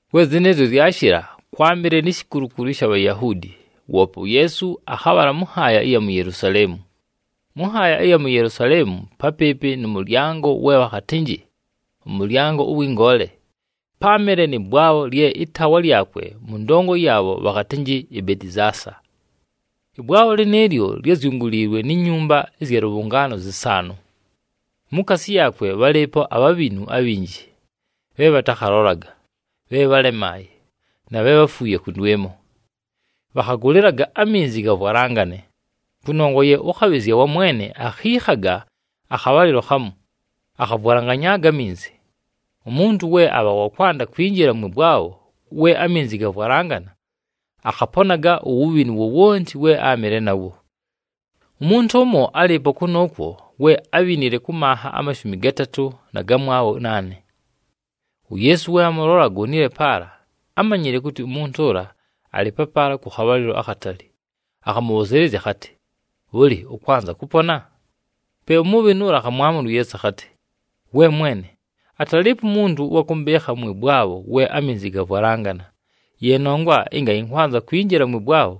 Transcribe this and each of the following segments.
We zɨnɨɨzyo zyashɨla, kwámɨle ni shikulukulu ɨsha Bhayahuudi, woope uYeesu akhabhala mʉ nhaaya ɨya mu Yelusaleemu. Mʉ nhaaya ɨya mu Yelusaleemu, papɨɨpɨ nʉ mʉlyango we bhakhatɨnjɨ, “ɄMʉlyango ʉwɨ Ngoole,” páamɨle nɨ bwabho lye ɨtaawa lyakwe mʉ ndongo yaabho bhakhatɨnjɨ iBetizaasa. Ɨbwabho lɨnɨɨlyo lyázyunguliilwe ni nyumba ɨzya lʉbhʉngaano zɨsaanʉ. Mukaasi yaakwe bhalɨɨpo abhabhinu abhinji, bhe bhatakhalolaga, bhe bhálemaaye, na bhe bháfuuye kʉndwɨmo. [Bhakhagʉlɨlaga aminzi gavwalangane, kʉnongwa ye ʉkhabhɨzya wa Mwene akhiikhaga akhabhalɨlo khamu, akhavwalanganyaaga aminzi. Umuntu we abha wa kwanda kwinjila mwɨ bwabho we aminzi gavwalangana akhaponaga uwubhinu wowonti we áamɨle nawo.] Umuntu ʉmo álɨɨpo kʉnʉʉkwo we ábhinile kʉ manha amashumi gatatʉ na gamwabho naane. UYeesu we amʉlola agonile paala, ámanyile kʉtɨ umuntu ʉla alɨ papaala kʉ khabhalɨlo akhatali, akhamʉbhʉzɨɨlɨzya akhatɨ, “Bhʉlɨ, ʉkwanza kʉpona?” Pe umubhinu ʉla akhamwamʉla uYeesu akhatɨ, “We mwene, atalɨɨpo umuntu ʉwa kʉmbɨɨkha mwɨ bwabho we aminzi gavwalangana. Ye nongwa ɨnga ɨnkwanza kwinjila mwɨ bwabho,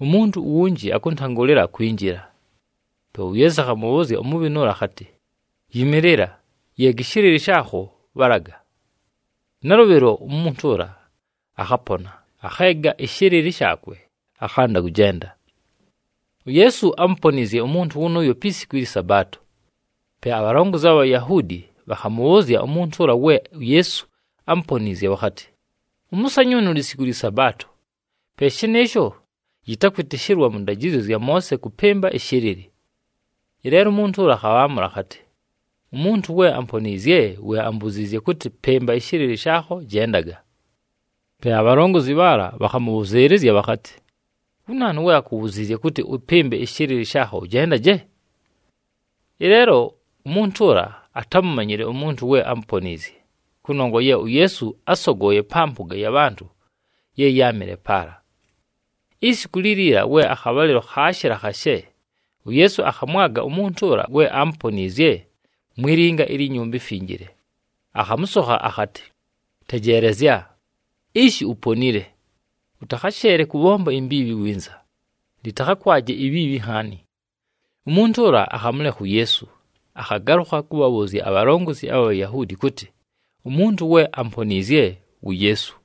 umuntu uwunji akʉntangʉlɨla kwinjila.” Pe uYeesu akhamʉbhʉʉzya umubhinu ʉla akhatɨ, “Yɨmɨɨlɨla, yeega ɨshɨlɨlɨ shaakho, bhalaga.” Nalʉbhɨlo, umuntu ʉla akhapona, akheega ɨshɨlɨlɨ shaakwe, akhanda kʉjenda. UYeesu ámuponiizye umuntu wʉnʉʉyo pi siku ɨlyɨ Sabaato. Pe abhalongozi abha Bhayahuudi bhakhamʉbhʉʉzya umuntu ʉla we uYeesu ámuponiizye bhakhatɨ, “Ʉmʉsanyʉʉnʉ lisiku lyɨ Sabaato, pe shɨnɨɨsho yɨtakwɨtɨshɨlwa mʉ ndajɨzyo zya Moose kʉpɨmba ɨshɨlɨlɨ.” Ɨleelo umuntu ʉla akhabhaamʉla akhatɨ, “Umuntu we amponiizye we ambuziizye kʉtɨ, ‘Pɨmba ɨshɨlɨlɨ shaakho, jendaga.’” Pe abhalongozi bhaala bhakhamʉbhʉzɨɨlɨzya bhakhatɨ, “Wu naanu we akubhuziizye kʉtɨ ʉpɨmbe ɨshɨlɨlɨ shaakho ʉjendaje?” Ɨleelo umuntu ʉla atámumanyile umuntu we ámuponiizye, kʉnongwa ye uYeesu ásogooye pa mpʉga ya bhantʉ ye yáamɨle paala. Isiku liliila we akhabhalɨlo khaashɨla khashe, uYeesu akhamwaga umuntu ʉla we aamuponiizye mwi linga ilyi Nyumba iMfinjile, akhamʉsokha akhatɨ, “Tejeelezya, ishi uponile. Ʉtakhasheele kʉbhomba imbiibhi winza, lɨtakhakwaje ibhiibhi nhaani.” Umuntu ʉla akhamʉlekha uYeesu, akhagalʉkha kʉbhabhʉʉzya abhalongozi abha Bhayahuudi kʉtɨ umuntu we amponiizye wu Yeesu.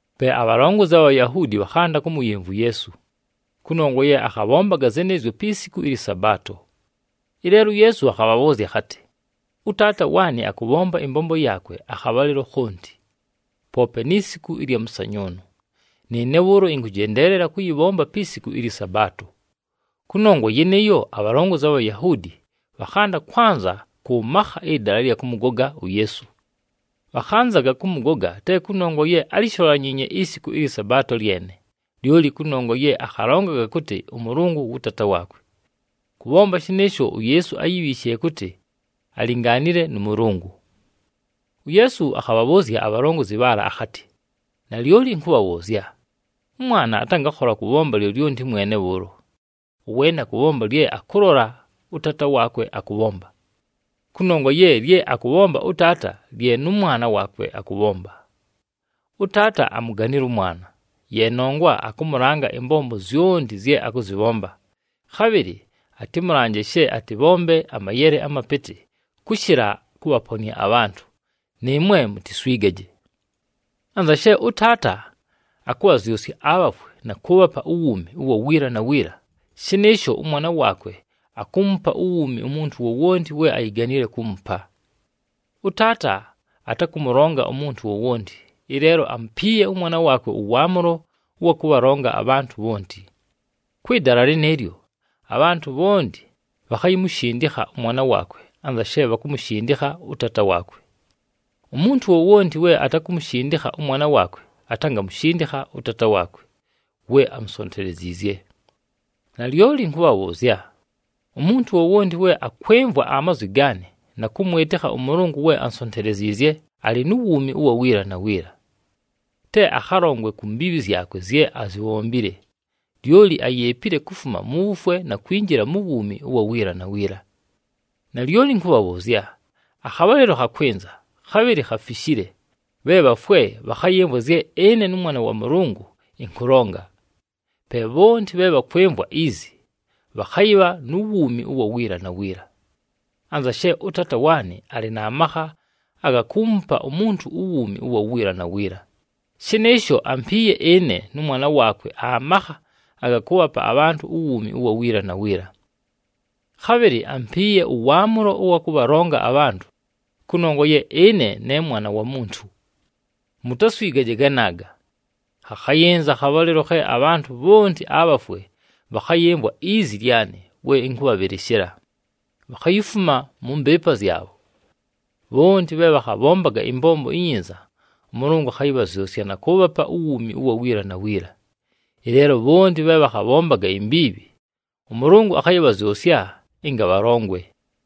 Pe abhalongozi abha Bhayahuudi bhakhanda kʉmʉyɨmvwa uYeesu, kʉnongwa ye akhabhombaga zɨnɨɨzyo pi siku ɨlyɨ Sabaato. Ɨleelo uYeesu akhabhabhʉʉzya akhatɨ, “ɄTaata waanɨ akʉbhomba ɨmbombo yaakwe akhabhalɨlo khonti, poope ni siku ɨlya mʉsanyʉʉnʉ. Nɨɨne bhʉʉlo ɨnkʉjendeelela kʉyɨbhomba pi siku ɨlyɨ Sabaato.” Kʉnongwa yɨnɨɨyo, abhalongozi abha Bhayahuudi bhakhanda kwanza kʉ makha ɨdala ɨlya kʉmʉgoga uYeesu. Bhakhanzaga kʉmʉgoga te kʉnongwa ye álisholanyiinye isiku ɨlyɨ Sabaato lyene, lyoli kʉnongwa ye akhalongaga kʉtɨ ʉMʉlʉngʉ wʉ Taata waakwe. Kʉbhomba shɨnɨɨsho uYeesu áyibhiishile kʉtɨ alingaanile nʉ Mʉlʉngʉ. UYeesu akhabhabhʉʉzya abhalongozi bhaala akhatɨ, “Nalyoli ɨnkʉbhabhʉʉzya, ʉMwana atangakhola kʉbhomba lyolyonti mwene bhʉʉlo, ʉweene akʉbhomba lye akʉlola ʉTaata waakwe akʉbhomba, kʉnongwa ye lye akʉbhomba ʉTaata lye nʉ Mwana waakwe akʉbhomba. ɄTaata amuganile ʉMwana, ye nongwa akʉmʉlanga ɨmbombo zyonti zye akʉzɨbhomba, khabhɨlɨ atɨmʉlanje she atɨbhombe amayele amapɨtɨ kʉshɨla kʉbhaponɨa abhantʉ, nɨɨmwe mutiswigaje. Anza she ʉTaata akʉbhazyʉsya abhafwe na kʉʉbhapa uwuumi ʉwa wiila na wiila, shɨnɨɨsho ʉMwana waakwe akuumupa uwuumi umuntu wowonti we ayiganile kuumupa. ɄTaata atakʉmʉlonga umuntu wowonti, ɨleelo amupiiye ʉMwana waakwe ʉwaamʉlo ʉwa kʉbhalonga abhantʉ bhonti. Kwɨ dala lɨnɨɨlyo, abhantʉ bhonti bhakhayimushindikha ʉMwana waakwe anza she bhakumushindikha ʉTaata waakwe. Umuntu wowonti we atakumushindikha ʉMwana waakwe atangamushindikha ʉTaata waakwe we amusonteleziizye. “Nalyoli ɨnkʉbhabhʉʉzya, umuntu wowonti we akwɨmvwa amazwi gaanɨ na kʉmwɨtɨkha ʉMʉlʉngʉ we ansonteleziizye, alɨ nu wuumi ʉwa wiila na wiila. Te akhalongwe ku mbiibhi zyakwe zye azibhombile, lyoli ayeepile kufuma mu wufwe na kwinjila mu wuumi ʉwa wiila na wiila. Nalyoli ɨnkʉbhabhʉʉzya, akhabhalɨlo khakwɨnza, khabhɨlɨ khafishile, bhe bhafwe bhakhayɨmvwa zye ɨne nʉMwana wa Mʉlʉngʉ ɨnkʉlonga. Pe bhonti bhe bhakwɨmvwa izi, bhakhayɨbha nu wuumi ʉwa wiila na wiila. Anza she ʉTaata waanɨ alɨ na makha aga kuumupa umuntu uwuumi ʉwa wiila na wiila, shɨnɨɨsho ampiiye ɨne nʉMwana waakwe amakha aga kʉʉbhapa abhantʉ uwuumi ʉwa wiila na wiila. Khabhɨlɨ ampiiye ʉwaamʉlo ʉwa kʉbhalonga abhantʉ, kʉnongwa ye ɨne ne Mwana wa Muntu. Mutaswigaje ganaaga! Khakhayɨnza akhabhalɨlo khe abhantʉ bhonti abhafwe bhakhayɨmvwa izi lyanɨ we ɨnkʉbhabhɨlɨshɨla, bhakhayifuma mʉ mbɨɨpa zyabho. Bhonti bhe bhakhabhombaga ɨmbombo inyinza, ʉMʉlʉngʉ akhayɨbhazyʉsya na kʉʉbhapa uwuumi ʉwa wiila na wiila. Ɨleelo bhonti bhe bhakhabhombaga imbiibhi, ʉMʉlʉngʉ akhayɨbhazyʉsya ɨnga bhalongwe.”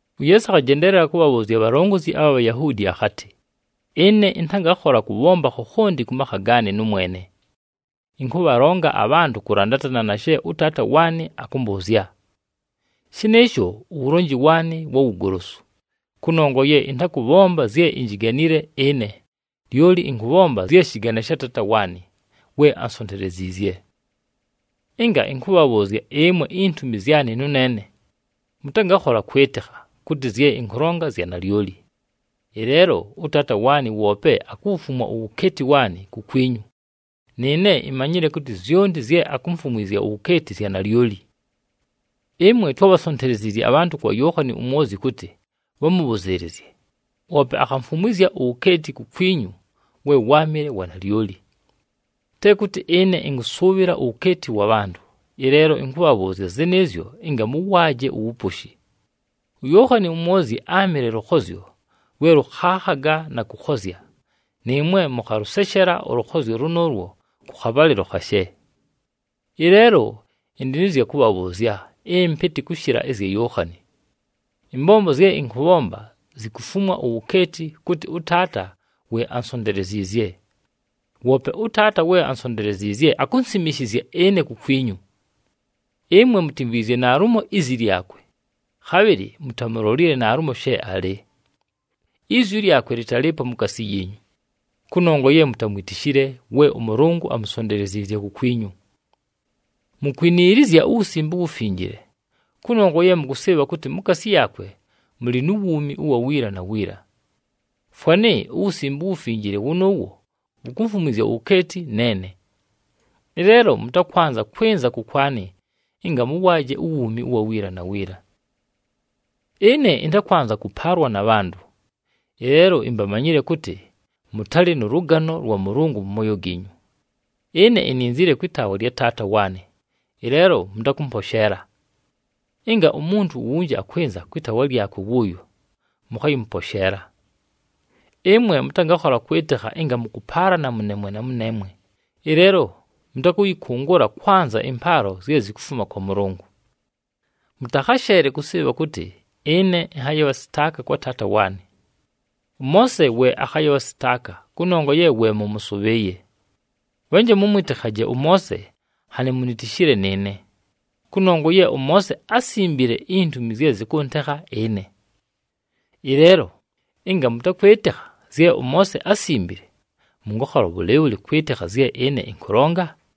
UYeesu akhajendeelela kʉbhabhʉʉzya abhalongozi abha Bhayahuudi akhatɨ, “Ɨne ɨntangakhola kʉbhomba khokhonti kʉ makha gaanɨ nʉmwene. Ɨnkʉbhalonga abhantʉ kʉlandatana na she ʉTaata waanɨ akʉmbʉʉzya. Shɨnɨɨsho uwulonji waanɨ wa wugolosu, kʉnongwa ye ɨntakʉbhomba zye injiganile ɨne, lyoli ɨnkʉbhomba zye shɨgane sha Taata waanɨ we ansonteleziizye. Ɨnga ɨnkʉbhabhʉʉzya ɨmwe intumi zyanɨ nʉneene, mʉtangakhola kwɨtɨkha kʉtɨ zye ɨnkʉlonga zya nalyoli. Ɨleelo ʉTaata waanɨ woope akuwufumwa uwukeeti waanɨ kukwinyu, nɨɨne imanyile kʉtɨ zyonti zye akumfumwizya uwukeeti zya nalyoli. “Ɨmwe twábhasonteleziizye abhantʉ kwa Yookhani uMwozyi kʉtɨ bhamʉbhʉzɨɨlɨzye, woope akhamfumwizya uwukeeti kukwinyu we wáamɨle wa nalyoli. Te kʉtɨ ɨne ɨnkʉsʉʉbhɨla uwukeeti wa bhantʉ, ɨleelo ɨnkʉbhabhʉʉzya zɨnɨɨzyo ɨnga mʉwaaje uwuposhi. UYookhani uMwozyi áamɨle lʉkhozyo lwe lʉkhaakhaga na kʉkhozya, nɨɨmwe mʉkhalʉseshela ʉlʉkhozyo lʉnʉʉlwo kʉ khabhalɨlo khashe. Ɨleelo ɨndɨ nɨ zya kʉbhabhʉʉzya ɨmpɨtɨ kʉshɨla ɨzya Yookhani. Ɨmbombo zye ɨnkʉbhomba zikufumwa uwukeeti, kʉtɨ ʉTaata we ansonteleziizye. Woope ʉTaata we ansonteleziizye, akunsimishizya ɨne kukwinyu. Ɨmwe mutimvwizye naalumo izi lyakwe, khabhɨlɨ mutamulolile naalumo she alɨ. Izwi lyakwe lɨtalɨɨpo mukaasi yiinyu, kʉnongwa ye mutamwitishile we ʉMʉlʉngʉ amusonteleziizye kukwinyu. Mukwiniilizya uWusimbe uWufinjile, kʉnongwa ye mʉkʉsɨɨbha kʉtɨ mukaasi yaakwe mʉlɨ nu wuumi ʉwa wiila na wiila. Fwanɨ uWusimbe uWufinjile wʉnʉʉwo wukumfumwizya uwukeeti neene. Ɨleelo mʉtakwanza kwɨnza kʉkwanɨ ɨnga mʉwaaje uwuumi ʉwa wiila na wiila. “Ɨne ɨntakwanza kʉpaalwa na bhantʉ, ɨleelo imbamanyile kʉtɨ mʉtalɨ nʉ lʉgano lwa Mʉlʉngʉ mʉ mooyo giinyu. Ɨne ininzile kwɨ taawa lya Taata waanɨ, ɨleelo mʉtakʉmposheela. Ɨnga umuntu uwunji akwɨnza kwɨ taawa lyakwe wʉʉyo, mʉkhayɨmʉposheela. Ɨmwe mʉtangakhola kwɨtɨkha ɨnga mʉkʉpaalana mʉneemwe na mʉneemwe, ɨleelo mʉtakʉyɨkʉngʉla kwanza ɨmpaalo zye zikufuma kwa Mʉlʉngʉ. Mʉtakhasheele kʉsɨɨbha kʉtɨ ɨne ɨnhayɨbhasɨtaaka kwa Taata waanɨ. ɄMoose we akhayɨbhasɨtaaka kʉnongwa ye we mʉmʉsʉbhɨɨye. Bhanje mʉmwɨtɨkhaje ʉMoose nhanɨ munitishile nɨɨne, kʉnongwa ye ʉMoose ásimbile intumi zye zɨkʉntekha ɨne. Ɨleelo ɨnga mʉtakwɨtɨkha zye ʉMoose ásimbile, mʉngakhola bhʉlɨɨbhʉlɨ kwɨtɨkha zye ɨne ɨnkʉlonga?”